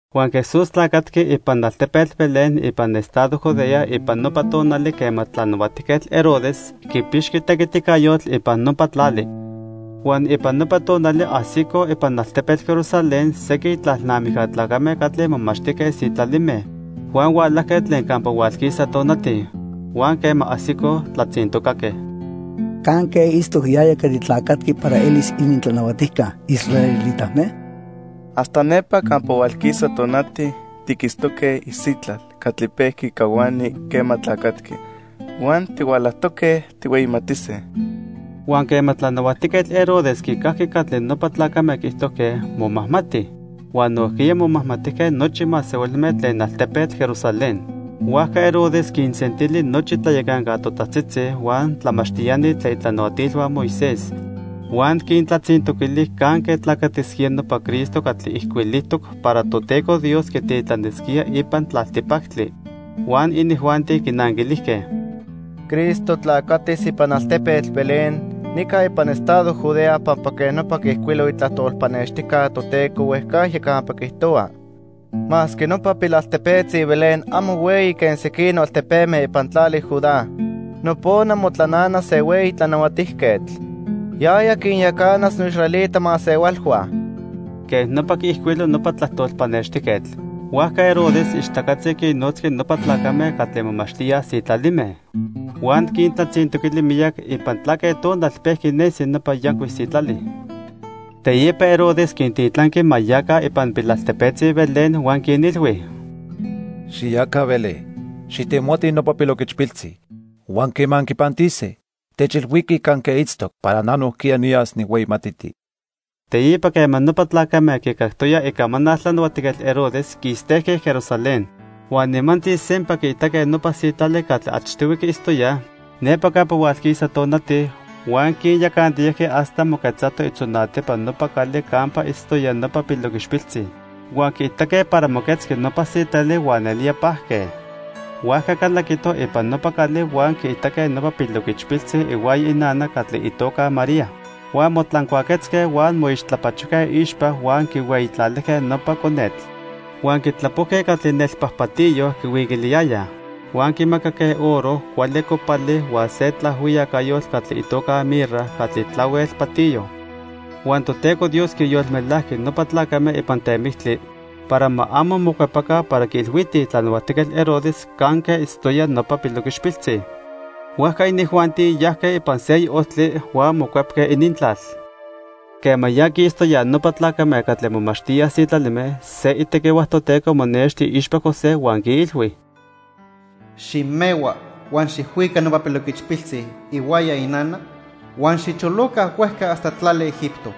Huan Jesús tlacatqui ipan altepetl Belén ipan estado Judea ipan nopa tonali quema Tlanahuatijquetl Herodes quipixqui tequiticayotl ipan nopa tlali. Huan ipan nopa tonali ajsicoj ipan altepetl Jerusalén sequin tlalnamijca tlacame catli momachtijque sitlalime huan hualajque tlen campa hualquisa tonati. Huan quema ajsicoj, tlatzintocaque: —¿Canque itztoc yaya catli tlacatqui para elis inintlanahuatijca israelitame? Hasta nepa campa hualquisa tonati, tiquitztoque isitlal catli pejqui cahuani quema tlacatqui. Huan tihualajtoque tijhueyimatise. Huan quema Tlanahuatijquetl Herodes quicajqui catli nopa tlacame quiijtojque, momajmati. Huan nojquiya momajmatijque nochi masehualme tlen altepetl Jerusalén. Huajca Herodes quinsentili nochi tlayacanca totajtzitzi, huan tlamachtiani tlen itlanahuatilhua Moisés; huan quintlatzintoquili canque tlacatisquía nopa Cristo catli ijcuilijtoc para Toteco Dios quititlanisquía ipan tlaltipactli. Huan inijuanti quinanquilijque: —Cristo tlacatis ipan altepetl Belén nica ipan estado Judea pampa quej nopa quiijcuilo itlajtol pannextijca Toteco huejcajya campa quiijtohua: 'Masque nopa pilaltepetzi Belén amo hueyi quen sequinoc altepeme ipan tlali Judá, nopona motlananas se hueyi tlanahuatijquetl. Yaya quinyacanas noisraelita masehualhua.' Quej nopa quiijcuilo nopa tlajtol pannextijquetl. Huajca Herodes ichtacatzi quinnotzqui nopa tlacame catli momachtíaj sitlalime. Huan quintlatzintoquili miyac ipan tlaque tonal pejqui nesi nopa yancuic sitlali. Teipa Herodes quintitlanqui ma yaca ipan pilaltepetzi Belén huan quinilhui: —Xiyaca Belén, xijtemotij nopa piloquichpiltzi, huan quema anquipantise, techilhuiquij canque itztoc para na nojquiya niyas nijhueyimatiti. Teipa quema nopa tlacame quicactoyaj icamanal Tlanahuatijquetl Herodes, quistejque Jerusalén. Huan nimantzi sempa quiitaque nopa sitlali catli achtihui quiitztoyaj nepa campa hualquisa tonati, huan quinyacantiyajqui hasta moquetzato itzonatipa nopa cali campa itztoya nopa piloquichpiltzi. Huan quiitaque para moquetzqui nopa sitlali huan nelía pajque. Huajca calaquitoj ipan nopa cali huan quiitaque nopa piloquichpiltzi ihuaya inana catli itoca María. Huan motlancuaquetzque huan moixtlapachojque iixpa huan quihueyitlalijque nopa conetl. Huan quitlapojque catli nelpajpatiyo quihuiquiliyayaj. Huan quimacaque oro, cuali copali huan se tlaajhuiyacayotl catli itoca mirra catli tlahuel patiyo. Huan Toteco Dios quinyolmelajqui nopa tlacame ipan temictli para ma amo mocuepaca para quiilhuitij Tlanahuatijquetl Herodes canque itztoya nopa piloquichpiltzi. Huajca inijuanti yajque ipan seyoc ojtli huan mocuepque inintlal. Quema ya quistoyaj nopa tlacame catli momachtíaj sitlalime, se itequihua Toteco monexti iixpa José huan quiilhui: "Ximehua huan xijhuica nopa piloquichpiltzi ihuaya inana huan xicholoca huejca hasta tlali Egipto.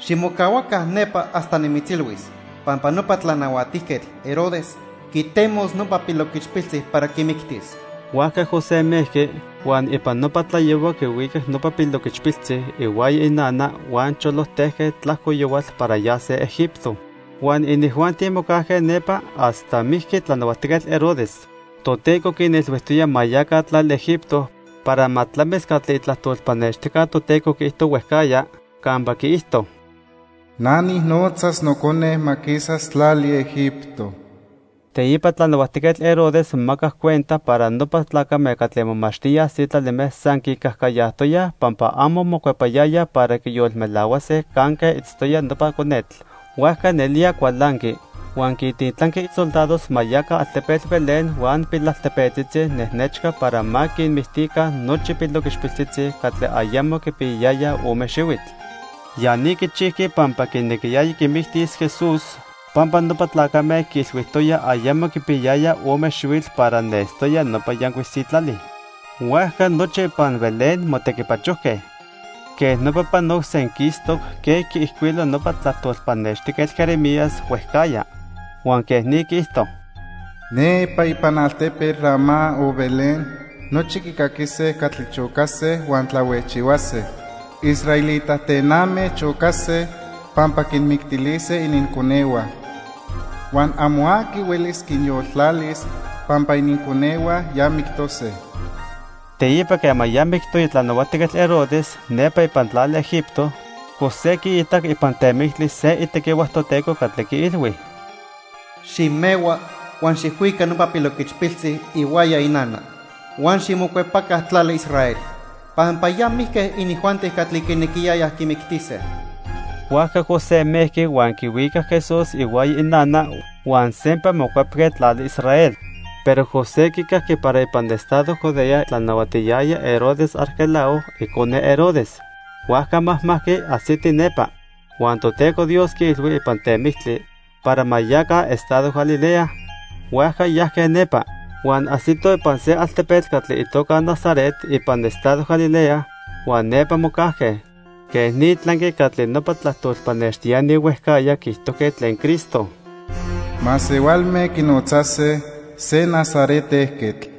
Ximocahuaca nepa hasta nimitzilhuis pampa nopa Tlanahuatijquetl Herodes quitemos nopa piloquichpiltzi para quimictis." Huajca José mejqui, huan ipan nopa tlayohua quihuicac nopa piloquichpiltzi ihuaya inana huan cholojtejque tlajco yohual para yase Egipto. Huan inijuanti mocajque nepa hasta mijqui Tlanahuatijquetl Herodes. Toteco quinilhuijtoya ma yaca tlali Egipto para ma tlamis catli itlajtol pannextijca Toteco quiijto huejcajya campa quiijto: "Na nijnotzas Nocone ma quisas tlali Egipto." Teipa Tlanahuatijquetl Herodes momacac cuenta para nopa tlacame catli momachtíaj sitlalime san quicajcayajtoyaj pampa amo mocuepayayaj para quiyolmelahuase canque itztoya nopa conetl. Huajca nelía cualanqui. Huan quintitlanqui soldados ma yaca altepetl Belén huan pilaltepetzitzi nejnechca para ma quinmictica nochi piloquichpiltzitzi catli ayamo quipiyayayaj ome xihuitl. Ya ni quichijqui pampa quinequiyaya quimictis Jesús, pampa nopa tlacame quiilhuijtoyaj ayamo quipiyayaya ome xihuitl para nestoya nopa yancuic sitlali. Huajca nochi ipan Belén motequipachojque. Quej nopa panoc senquistoc quen quiijcuilo nopa tlajtol pannextijquetl Jeremías huejcajya, huan quej ni quiijto: "Nepa ipan altepetl Ramá o Belén nochi quicaquise catli chocase huan tlahuejchihuase. Israelita tename chocase pampa quinmictilise ininconehua. Huan amo aqui huelis quinyoltlalis pampa ininconehua ya mictose." Teipa quema ya mictoya Tlanahuatijquetl Herodes, nepa ipan tlali Egipto, José quiitac ipan temictli se itequihua Toteco catli quiilhui: "Ximehua huan xijhuica nopa piloquichpiltzi ihuaya inana huan ximocuepaca tlali Israel, pampa ya mijque inijuanti catli quinequiyayaj quimictise." Huajca José mejqui huan quihuicac Jesús ihuaya inana, huan sempa mocuepque tlali Israel. Pero José quicajqui para ipan estado Judea tlanahuatiyaya Herodes Arquelao, icone Herodes, huajca majmajqui ajsiti nepa. Huan Toteco Dios quiilhui ipan temictli para ma yaca estado Galilea, huajca yajque nepa. Huan ajsitoj ipan se altepetl catli itoca Nazaret ipan estado Galilea, huan nepa mocajque. Quej ni tlanqui catli nopa tlajtol pannextiani huejcajya quiijtojque tlen Cristo: "Masehualme quinotzase se Nazaret ejquetl."